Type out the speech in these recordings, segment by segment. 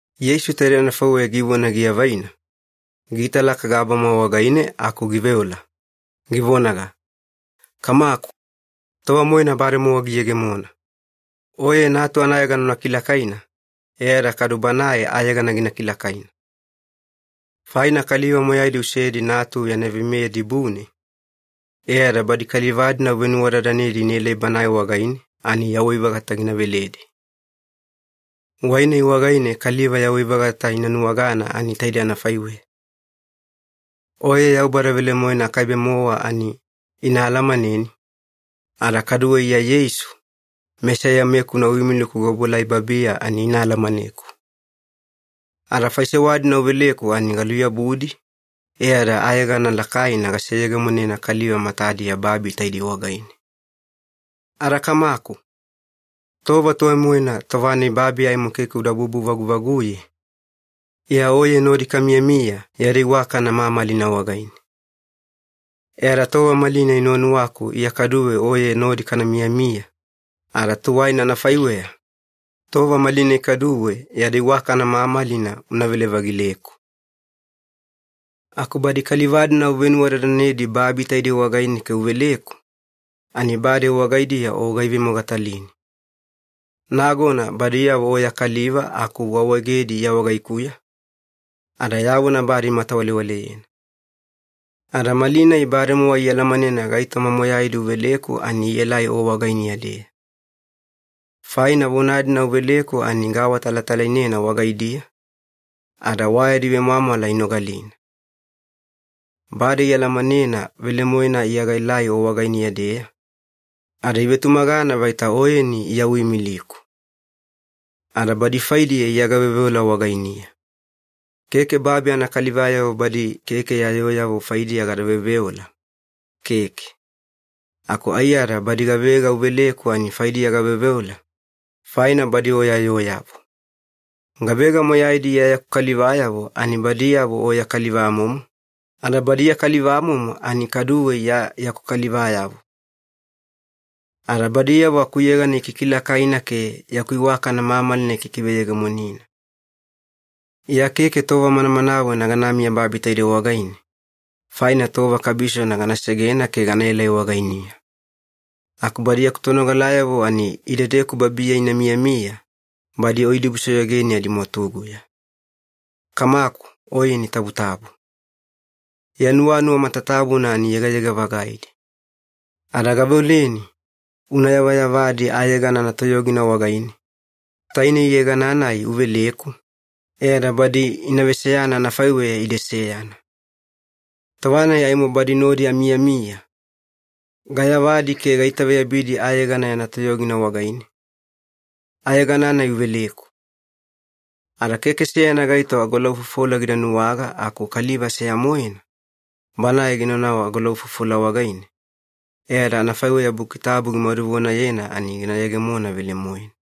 Yeisu taidei anafaiweya givona giavaina, giitalaka gabama wagaine aku giveola, givonaga, “Kamaku, tova-moena bademowa giyegemona. Oye Natu anayegana una kilakaina e ada kadu Banae ayegana gina kilakaina. Faina kaliva moyaidi usedi Natu yana veimeya dibune, e ada badi kaliva-dina uvenuwadadanedi inaelai Banae wagaine ani yawai-vagata gina veledi. Wai-nai wagaine kaliva yawai-vagata ina nuwagana ani taidei anafaiweya. Oye Yaubada velemoena akaibe-mowa ani ina alamaneni, ada kaduwe Iya Yeisu, Mesaiya-mekuna uimiliku gaobuelai babiya ani ina alamaneku. Ada faisewa-dina uveleku ani galuyabudi e ada ayegana lakaina gaseyegemonena kaliva matadiya babi taidei wagaine. Ada Kamaku, tova tuwai-moena tova-nai babi aimo keke uda bubu-vaguvaguye, Iya Oye nodi kamiyamiya yada iwakana mamalina wagaine. E ada tova malinai nuwanuwaku Iya kaduwe Oye nodi kana miyamiya, ada tuwaina anafaiweya, tova malinai kaduwe yada iwakana mamalina unavele-vagileku. “Aku badi kaliva-dina uvenuwadadanedi babi taidei wagaine ke uveleku, ani bade wagaidiya O gaivemogatalini. Nagona badiyavo O ya kaliva aku uawaegedi Iya wagaikuya, ada ya vona bade imatawalewaleyena. Ada malinai bademowa ialamanena gaitoma moyaidi uveleku ani ielai O wagainiya-deya. Faina vona-dina uveleku ani gaawatalatalainena wagaidiya, ada wa yadi vemwamwala inogalina. Bade ialamanena velemoena Iya gaelai O wagainiya-deya, ada ivetumagana vaita Oyeni Iya uimiliku. “Ada badi faidiya Iya gaveoveola wagainiya. Keke babi anakalivayavo badi keke ya yooyavo faidiya gada veoveola, keke. Aku aiyada badi gavega uveleku ani faidiya gaveoveola, faina badi O ya yooyavo. Gavega moyaidi Iya yaku kalivayavo ani badiyavo O ya kalivamomo, ada badi ya kalivamomo ani kaduwe Iya yaku kalivayavo. Ada badiyavo akuyegana ikikilakaina ke yaku iwakana mamalina ikikiveyegemonina. Iya keke tova manamanawena ganamiya babi taidei wagaine, faina tova kabisona gana segena ke ganaelai wagainiya. Aku badi yaku tonogalayavo ani idedeku babiya ina miyamiya badi O idibusoyogeni adimwatuguya. Kamaku Oyeni tabutabu. Ya nuwanuwa matatabuna ani yegayega-vagaidi. Ada gaveoleni una yavayavadi ayegana anatoyogina wagaine, tainei yegana-nai uveleku, e ada badi ina veseyana anafaiweya ide seyana. Tova-nai aimo badi nodi amiyamiya, gayavadi ke gaitaveyabidi ayegana yana toyogina wagaine, ayegana-nai uveleku. Ada keke seyana gaito agolaufofola gida nuwaga aku kaliva seya-moena, banae ginaunau agolaufofola wagaine, e ada anafaiweya Buki Tabu gimaduvonayena ani gina yegemona velemoena.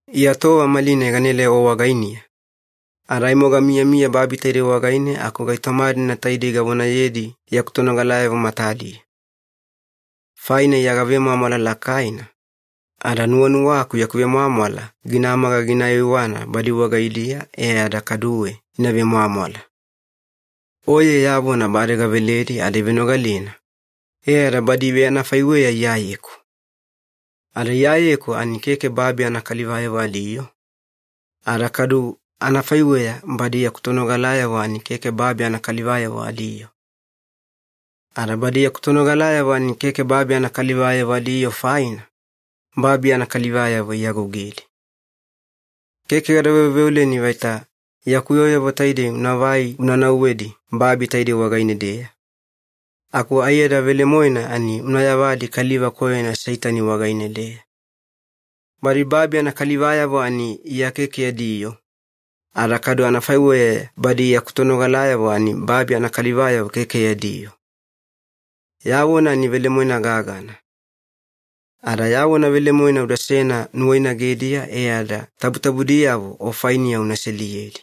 “Iya tova malinai ganaelai O wagainiya, ada aimo gamiyamiya babi taidei wagaine aku gaitoma-dina taidei gavonayedi yaku tonogalayavo matadiya. Faina Iya gavemwamwala lakaina, ada nuwanuwaku yaku vemwamwala ginamaga gina aiwaiwana badi wagaidiya e ada kaduwe ina vemwamwala. Oye ya vona bade gaveledi ada ivenogalena, e ada badi iveanafaiweya Iyayeku. Ada Iyayeku ani keke babi anakalivayavo adiyoo, ada kadu anafaiweya badi yaku tonogalayavo ani keke babi anakalivayavo adiyoo. Ada badi yaku tonogalayavo ani keke babi anakalivayavo adiyoo faina, babi anakalivayavo iagougedi. Keke gada veoveoleni vaita yaku yooyavo taidei unavai una nauwedi babi taidei wagaine-deya, aku aiyada velemoena ani una yavadi kaliva koyona Seitani wagaine-deya. Badi babi anakalivayavo ani Iya keke yadi yoo, ada kadu anafaiweya badi yaku tonogalayavo ani babi anakalivayavo keke yadi yoo. Ya vona ani velemoena gagana. Ada ya vona velemoena udasena nuwainagediya e ada tabutabudiyavo O fainiya una seliyedi.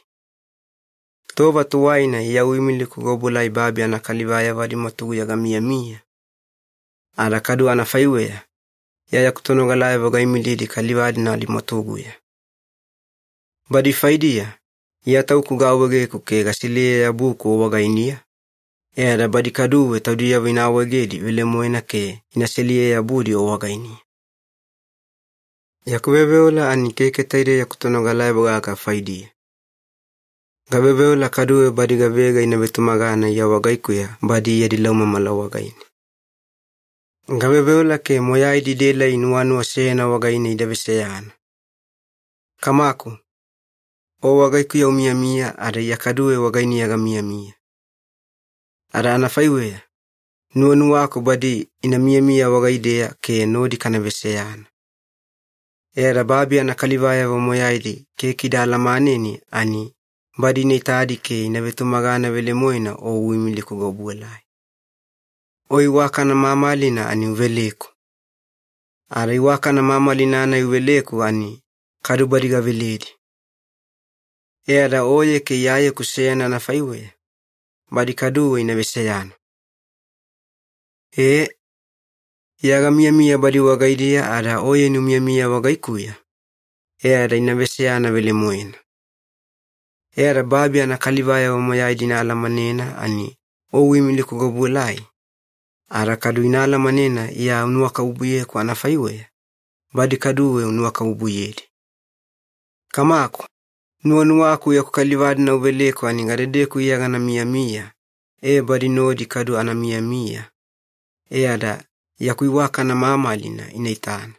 Tova tuwaina Iya uimiliku gaobuelai babi anakalivayavo adimwatuguya gamiyamiya, ada kadu anafaiweya Iya yaku tonogalayavo gaimilidi kaliva-dina adimwatuguya. Badi faidiya Iya Tauku gaawaegeku ke gaseliye-yabuku O wagainiya, e ada badi kaduwe taudiyavo ina awaegedi velemoena ke ina seliye-yabudi O wagainiya. “Yaku veoveola ani keke taidei yaku tonogalayavo gaga faidiya. Gaveoveola kaduwe badi gavega ina vetumagana Iya wagaikuya badi yadi laumamala wagaine. Gaveoveola ke moyaidi idaelai nuwanuwa seyana wagaine ida veseyana. Kamaku, O wagaikuya umiyamiya ada Iya kaduwe wagainiya gamiyamiya. Ada anafaiweya, nuwanuwaku badi ina miyamiya wagaideya ke nodi kana veseyana. E ada babi anakalivayavo moyaidi keke ida alamaneni ani badi ina itadi ke ina vetumagana velemoena O uimiliku gaobuelai. O iwakana mamalina ani uveleku. Ada iwakana mamalina-nai uveleku ani kadu badi gaveledi. E ada Oye ke Iyayeku seyana anafaiweya, badi kaduwe ina veseyana. E, Iya gamiyamiya badi wagaidiya ada Oyeni umiyamiya wagaikuya, e ada ina veseyana velemoena. E ada babi anakalivayavo moyaidi ina alamanena ani O uimiliku gaobuelai, ada kadu ina alamanena Iya unuwakabubuyeku anafaiweya, badi kaduwe unuwakabubuyedi. Kamaku, nuwanuwaku yaku kaliva-dina uveleku ani gadedeku Iya gana miyamiya ee badi nodi kadu ana miyamiya, e ada yaku iwakana mamalina ina itana.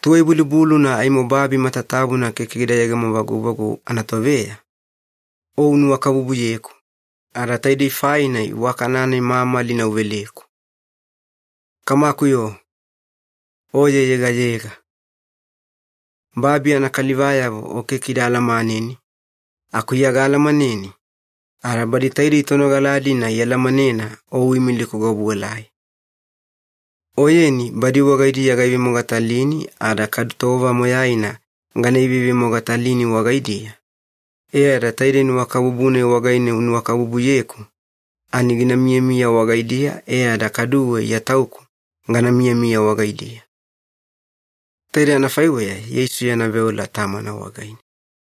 Tuwai-bulubuluna aimo babi matatabuna keke gida yegemo-vaguvagu anatoveya, O unuwakabubuyeku, ada taide faina iwakana-nai mamalina uveleku. Kamaku-yo, Oye yegayega. Babi anakalivayavo O keke ida alamaneni, aku Iya gaalamaneni, ada badi taidei tonogala-dina ialamanena O uimiliku gaobuelai. Oyeni badi wagaidiya gaivemogatalini ada kadu tova moyaina gana ivevemogatalini wagaidiya, e ada taidei nuwakabubu-nai wagaine unuwakabubuyeku ani gina miyamiya wagaidiya e ada kaduwe Iya Tauku gana miyamiya wagaidiya.” Taidei anafaiweya Yeisu yana veola Tamana wagaine.